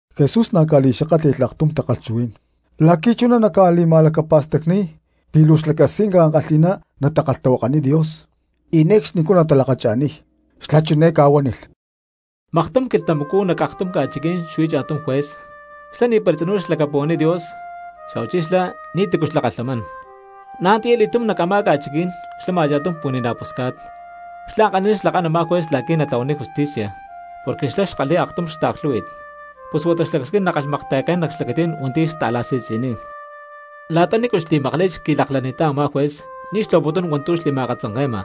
Jesús na̠ ca̠li̠xakátli̠lh aktum takalhchuhuí̠n la̠qui̠ chuná naca̠li̠ma̠lacapa̠stacni̠y pi̠ luu xlacasquinca ankalhi̠ná natakalhtahuakaniy Dios y ne̠cxni natalakacha̠niy. Xlá chiné ca̠huánilh: —Maktum quilhtamacú nac aktum ca̠chiquí̠n xuí cha̠tum juez, xlá ni̠para tzinú xlacapuhuaniy Dios, xa̠huachí xlá ni̠ti̠cu xlakalhamán. Na̠ antiya li̠túm nac a̠má ca̠chiquí̠n xlama cha̠tum pu̠ni̠na̠ pusca̠t, xlá ankalhi̠ná xlakán a̠má juez la̠qui̠ natlahuaniy justicia, porque xlá xkalhi̠y aktum xtaaklhú̠hui̠t, pus huata xlacasquín nakalhmakta̠yacán nac xlacatí̠n hua̠nti̠ xta̠la̠si̠tzi̠niy. La̠ta nícu xli̠makli̠t xqui̠laklacani̠ttá a̠má juez ni̠ xtlahuaputún hua̠ntu̠ xli̠ma̠akatzanke̠ma;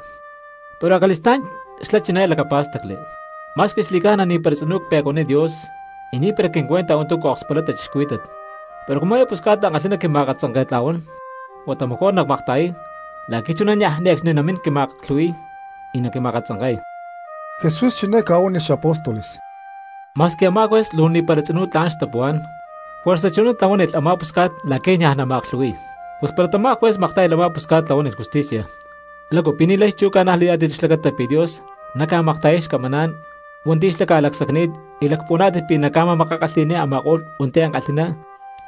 pero acali̠stá̠n xlá chiné lacapá̠stacli: “Ma̠squi xli̠ca̠na ni̠para tzinú cpe̠cuaniy Dios, y ni̠para quincuenta hua̠ntu̠ ca̠akspulay cristianos, pero cumu eé pusca̠t ankalhi̠ná quima̠akatzanke̠tla̠huán, huata mejor nacmakta̠yay la̠qui̠ chuná niaj ne̠cxni namín quima̠aklhu̠hui̠y y naquima̠katzanke̠y.” Jesús chiné ca̠huánilh xapóstoles: —Ma̠squi a̠má juez luu ni̠para tzinú tla̠n xtapuhuá̠n, juerza chuná tlahuánilh a̠má pusca̠t la̠qui̠ niaj nama̠aklhu̠hui̠y. Pus para tamá juez maktá̠yalh a̠má pusca̠t tlahuánilh justicia, ¿lácu pi̠ ni̠lay chú ca̠najlayá̠tit xlacata pi̠ Dios naca̠makta̠yay xcamaná̠n hua̠nti̠ xlá ca̠lacsacni̠t y lacpuhuaná̠tit pi̠ naca̠ma̠makakalhi̠ni̠y a̠ma̠ko̠lh hua̠nti̠ ankalhi̠ná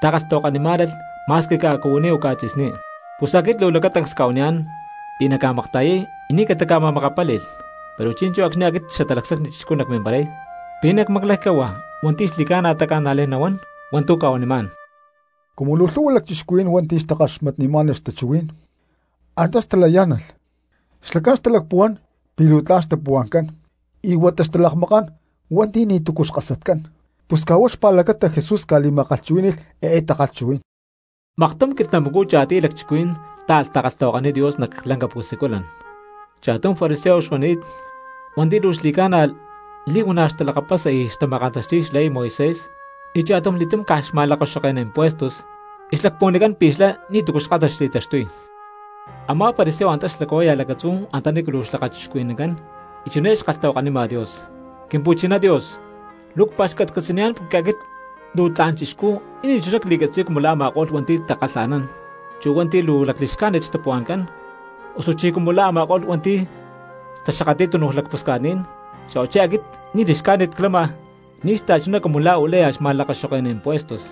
takalhtahuakanimá̠nalh ma̠squi ca̠cuhuiní o ca̠tzi̠sní? Pus aquit luu lacatancs cca̠huaniyá̠n pi̠ naca̠makta̠yay y ni̠ catica̠ma̠makapáli̠lh. Pero chi̠nchú acxni̠ aquit Xatalacsacni Chixcú nacmimparay, ¿pi̠ nacmaclaycú cahuá hua̠nti̠ xli̠ca̠na taca̠najlay nahuán la̠nchú cca̠huanimá̠n? Cumu luu lhu̠hua lacchixcuhuí̠n hua̠nti̠ xtakaxmatnimá̠nalh xtachuhuí̠n antá xtalayá̠nalh, xlacán xtalacpuhuán pi̠ luu tla̠n xtapuhua̠ncán y huata xtalakmakán hua̠nti̠ ni̠tu̠cu xkasatcán, pus caj huá xpa̠lacata Jesús ca̠li̠ma̠kalhchuhuí̠ni̠lh eé takalhchuhuí̠n: —Maktum quilhtamacú cha̠tiy lacchixcuhuí̠n táalh takalhtahuakaniy Dios nac lanca pu̠siculan; cha̠tum fariseo xuani̠t hua̠nti̠ luu xli̠ca̠na li̠huana̠ xtalakapasa y xtama̠kantaxti̠y xley Moisés, y cha̠tumli̠túm caj xma̠lakaxoke̠ná impúestos y xlacpuhuanicán pi̠ xlá ni̠tu̠cu xkásat xli̠taxtuy. Amá fariseo antá xlacahuáya lacatzú antanícu luu lakachixcuhuí̠nancán y chiné xkalhtahuakanima Dios: “Quimpu̠chiná Dios, luu cpa̠xcatcatzi̠niyá̠n porque aquit luu tla̠n chixcú y ni̠chuná cli̠catzi̠y cumu la̠ a̠ma̠ko̠lh hua̠nti̠ takalha̠nán, chu hua̠nti̠ luu lacli̠xcájnit xtapuhua̠ncán, osuchí cumu la̠ a̠ma̠ko̠lh hua̠nti̠ taxakatli̠y túnuj lacpusca̠tní̠n, xa̠huachí aquit ni̠ li̠xcájnit clama ni̠ xta̠chuná cumu la̠ u̠láya xma̠lakaxoke̠ná impuestos.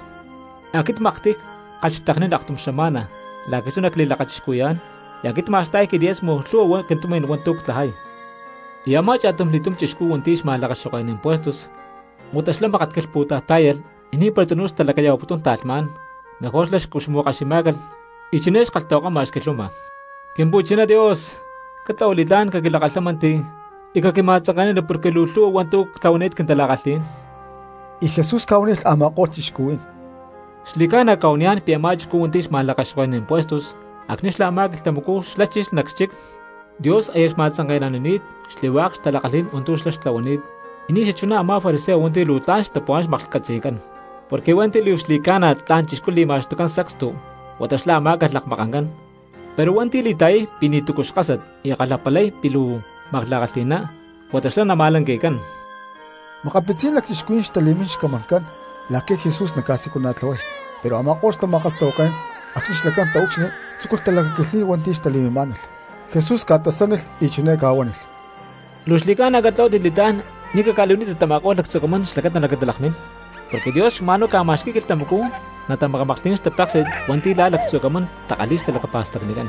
Aquit maktiy ckalhxteknín aktum xama̠na la̠qui̠ chuná cli̠lakachixcuhui̠yá̠n, y aquit cma̠sta̠y quilimosna lhu̠hua quintumi̠n hua̠ntu̠ ctlajay.” Y a̠má cha̠tumli̠túm chixcú hua̠nti̠ xma̠lakaxoke̠ná impuestos, huata xlá mákat quilhpu̠tay tá̠yalh y ni̠para tzinú xtalacaya̠huaputún ta̠lhmá̠n, mejor xlá xcuxmu̠kaximá̠calh y chiné xkalhtahuakama xquilhuama: “Quimpu̠chiná Dios, catlahua li̠tlá̠n caquilakalhámanti y caquima̠tzanke̠nani porque luu lhu̠hua hua̠ntu̠ ctlahuani̠t quintala̠kalhí̠n.” Y Jesús ca̠huánilh a̠ma̠ko̠lh cristianos: —Xli̠ca̠na cca̠huaniyá̠n pi̠ a̠má chixcú hua̠nti̠ xma̠lakaxoke̠ná impuestos acxni̠ a̠má quilhtamacú xlá chilh nac xchic, Dios aya xma̠tzanke̠nanini̠t xli̠hua̠k xtala̠kalhí̠n hua̠ntu̠ xlá xtitlahuani̠t, y ni̠ xachuná a̠má fariseo hua̠nti̠ luu tla̠n xtapuhuá̠n maklhcatzi̠cán. Porque hua̠nti̠ luu xli̠ca̠na tla̠n cristianos li̠ma̠xtucán sacstu huata xlá amá̠calh lakmakancán; pero hua̠nti̠ li̠ta̠yay pi̠ ni̠tu̠cu xkásat y kalhapalay pi̠ luu makla̠kalhi̠ná huata xlá namálanqui̠cán. Makapitzí̠n cristianos xtali̠mín xcamancán la̠qui̠ Jesús naca̠siculana̠tlahuay; pero a̠ma̠ko̠lh xtama̠kalhtahuaké̠n acxni̠ xlacán taúcxilhli tzúculh talacaquilhni̠y hua̠nti̠ xtali̠mimá̠nalh. Jesús ca̠tasánilh y chiné ca̠huánilh: —Luu xli̠ca̠na catlahuátit li̠tlá̠n ni̠ caca̠li̠huanítit tama̠ko̠lh lactzu̠ camán xlacata naquintalakmín; porque Dios caj xma̠nhuá ca̠ma̠xqui̠y quilhtamacú natamaklhti̠nán xtapéksi̠t hua̠nti̠ la̠ lactzu̠ camán takalhi̠y xtalacapa̠stacnicán.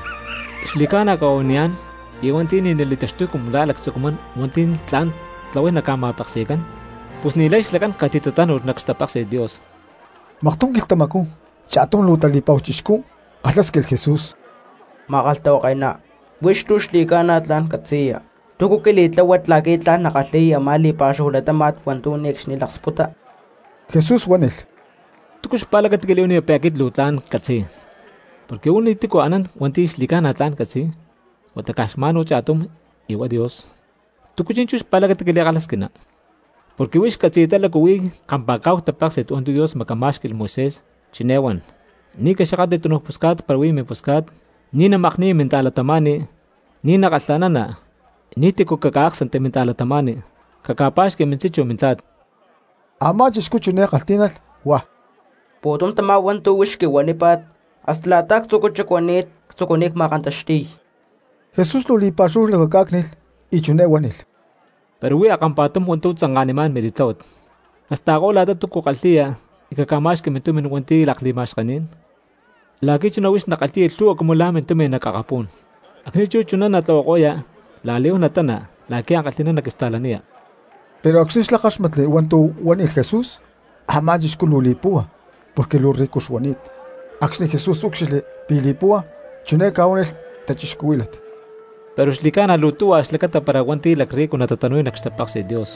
Xli̠ca̠na cca̠huaniyá̠n pi̠ hua̠nti̠ ni̠ natali̠taxtuy cumu la̠ lactzu̠ camán hua̠nti̠ tla̠n tatlahuay naca̠ma̠peksi̠cán, pus ni̠lay xlacán catitatánu̠lh nac xtapéksi̠t Dios. Maktum quilhtamacú cha̠tum luu tali̠pa̠hu chixcú kalhásquilh Jesús: —Ma̠kalhtahuake̠ná, huix luu xli̠ca̠na tla̠n catzi̠ya, ¿túcu quili̠tláhuat la̠qui̠ tla̠n nackalhi̠y a̠má li̠pa̠xúhu latáma̠t hua̠ntu̠ ne̠cxni laksputa? Jesús huánilh: —¿Túcu xpa̠lacata quili̠huaniya pi̠ aquit luu tla̠n ccatzi̠y? Porque uú ni̠ti̠cu anán hua̠nti̠ xli̠ca̠na tla̠n catzi̠y, huata caj xma̠n cha̠tum y huá Dios. ¿Túcu chi̠nchú xpa̠lacata quili̠kalhasquina? Porque huix catzi̠yatá lácu huí kampa̠cá̠hu tapéksi̠t hua̠ntu̠ Dios macamá̠xqui̠lh Moisés, chiné huan: “Ni̠ caxakatli túnuj pusca̠t para huí mimpusca̠t; ni̠ namakni̠ya minta̠cristiano; ni̠ nakalha̠nana; ni̠ti̠cu caca̠áksanti minta̠cristianos; caca̠pa̠xqui mintzí chu mintla̠t.” Amá chixcú chiné kalhtí̠nalh, huá: —Pu̠tum tamá hua̠ntu̠ huix quihuanípa̠t hasta la̠ta actzu̠cú xacuani̠t ctzucuni̠t ma̠kantaxti̠y. Jesús luu li̠pa̠xúhu lacacá̠cni̠lh y chiné huánilh: —Pero huí a̠kampa̠tum hua̠ntu̠ tzanka̠nimá̠n mili̠tláhuat: casta̠ko la̠ta túcua kalhi̠ya y caca̠ma̠xqui mintumi̠n hua̠nti̠ lakli̠ma̠xkení̠n, la̠qui̠ chuná huix nakalhi̠ya lhu̠hua cumu la̠ mintumi̠n nac akapú̠n. Acxni̠ chú chuná natlahuako̠ya la̠li̠huán natana la̠qui̠ ankalhi̠ná naquista̠laniya. Pero acxni̠ xlá káxmatli hua̠ntu̠ huánilh Jesús, a̠má chixcú luu li̠púhua porque luu rico xuani̠t. Acxni̠ Jesús úcxilhli pi̠ li̠púhua chiné ca̠huánilh cristianos: —Pero xli̠ca̠na luu tuhua xlacata para hua̠nti̠ lacrrico natatanu̠y nac xtapéksi̠t Dios.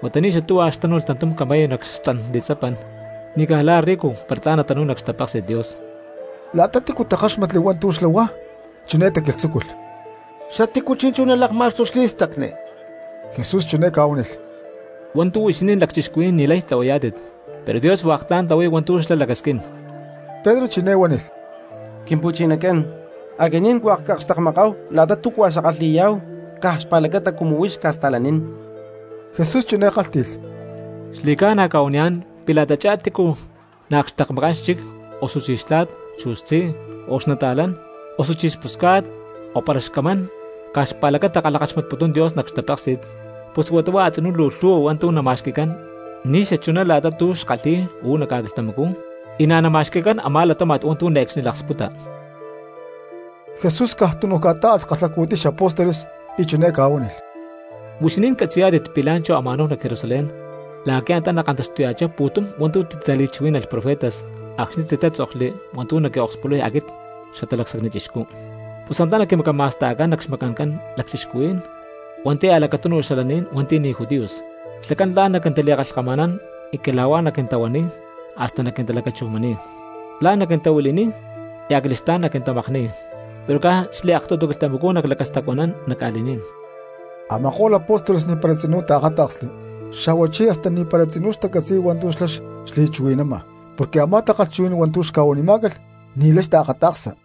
Huata ni̠ xatuhua xtánu̠lh tantum camello nac xtzan li̠tzapan, ni̠ caj la̠ rico para tla̠n natanu̠y nac xtapéksi̠t Dios. La̠ta tícua takáxmatli hua̠ntu̠ xlá huá, chiné taquilhtzúculh: —¿Xatícu chi̠nchú nalakma̠xtuy xli̠stacni? Jesús chiné ca̠huánilh: —Hua̠ntu̠ huixinín lacchixcuhuí̠n ni̠lay tlahuayá̠tit, pero Dios hua̠k tla̠n tlahuay hua̠ntu̠ xlá lacasquín. Pedro chiné huánilh: —Quimpu̠chinacán, aquinín hua̠k cakxtekmakani̠táhu la̠ta túcua xackalhi̠yá̠hu caj xpa̠lacata cumu huix cca̠sta̠lanín. Jesús chiné kálhti̠lh: —Xli̠ca̠na cca̠huaniyá̠n pi̠ la̠tachá tícu naakxtekmakán xchic, osuchí xtla̠t, chu xtzí, o xnata̠lán, osuchí xpusca̠t, o para xcamán caj xpa̠lacata kalhakaxmatputún Dios nac xtapéksi̠t, pus huata a̠tzinú luu lhu̠hua hua̠ntu̠ nama̠xqui̠cán ni̠ xachuná la̠ta tu̠ xkalhi̠y uú nac ca̠quilhtamacú, y na̠ nama̠xqui̠cán a̠má latáma̠t hua̠ntu̠ ne̠cxni laksputa. Jesús caj tunu ca̠tá̠alh kalhacu̠tiy xapóstoles y chiné ca̠huánilh: —Huixinín catzi̠yá̠tit pi̠ la̠nchú ama̠náhu nac Jerusalén la̠qui̠ antá nakantaxtuya̠chá pu̠tum hua̠ntu̠ titali̠chuhuí̠nalh profetas acxni̠ titátzokli hua̠ntu̠ naquiokspulay aquit Xatalacsacni Chixcú. Pus antá naquimacama̠sta̠cán nac xmacancán lacchixcuhuí̠n hua̠nti̠ a̠lacatúnuj xalaní̠n hua̠nti̠ ni̠ judíos; xlacán la̠n naquintali̠kalhkama̠nán, y cala̠huá naquintahuaniy hasta naquintalacachujmani̠y. La̠n naquintahuili̠niy, y acali̠stá̠n naquintamakni̠y; pero caj xliaktutu quilhtamacú naclacastacuanán nac ca̠li̠ní̠n. Ama̠ko̠lh apóstoles ni̠para tzinú taakáta̠ksli, xa̠huachí hasta ni̠para tzinú xtacatzi̠y hua̠ntu̠ xlá xli̠chuhui̠nama, porque a̠má takalhchuhuí̠n hua̠ntu̠ xca̠huanimá̠calh ni̠lay xtaakata̠ksa.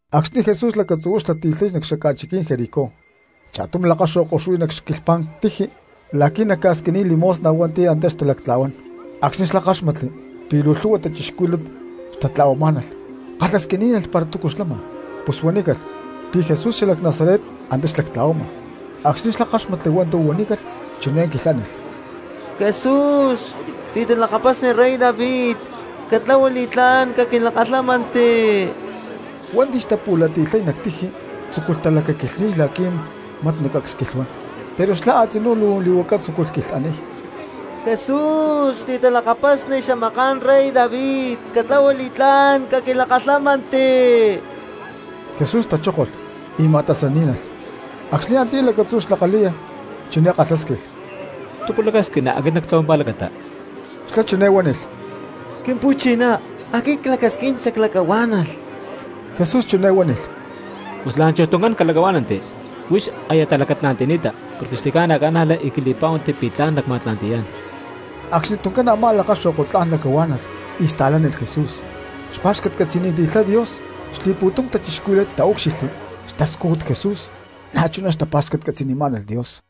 Acxni̠ Jesús lacatzu̠huá xlati̠lhay nac xaca̠chiquí̠n Jericó, cha̠tum lakaxo̠ko xuí nac xquilhpá̠n tiji la̠qui̠ naca̠squiniy limosna hua̠nti̠ antá xtalactla̠huán. Acxni̠ xlá káxmatli pi̠ luu lhu̠hua cristianos xtatla̠huamá̠nalh kalhasquiní̠nalh para túcu xlama. Pus huanícalh pi̠ Jesús xalac Nazaret antá xlactla̠huama. Acxni̠ xlá káxmatli hua̠ntu̠ huanícalh chiné quilhánilh: —¡Jesús, xli̠talakapasni rey David! ¡Catlahua li̠tlá̠n caquilakalhámanti! Hua̠nti̠ xtapu̠lati̠lhay nac tiji tzúculh talacaquilhni̠y la̠qui̠ mat nacacsquilhuán; pero xlá a̠tzinú luu li̠huaca tzúculh quilhaniy: —¡Jesús, xli̠talakapasni xamaká̠n rey David, catlahua li̠tlá̠n caquilakalhámanti! Jesús tachókolh y ma̠tasaní̠nalh. Acxni̠ antiyá lacatzú xlakaláya chiné kalhásquilh: —¿Túcu lacasquina aquit nactlahuay mimpa̠lacata? Xlá chiné huánilh: —Quimpu̠chiná, aquit clacasquín xaclacahuá̠nalh. Jesús chiné huánilh: —¡Pus la̠nchuj tuncán calacahuá̠nanti! Huix aya talacatla̠nti̠ni̠ta porque xli̠ca̠na ca̠najla y quili̠pá̠huanti pi̠ tla̠n nacma̠lacatla̠nti̠yá̠n. Acxni tuncán a̠má lakaxo̠ko tla̠n lacahuá̠nalh y sta̠lánilh Jesús, xpa̠xcatcatzi̠niti̠lhay Dios. Xli̠pu̠tum cristianos taúcxilhli xtascújut Jesús na̠chuná xtapa̠xcatcatzi̠nimá̠nalh Dios.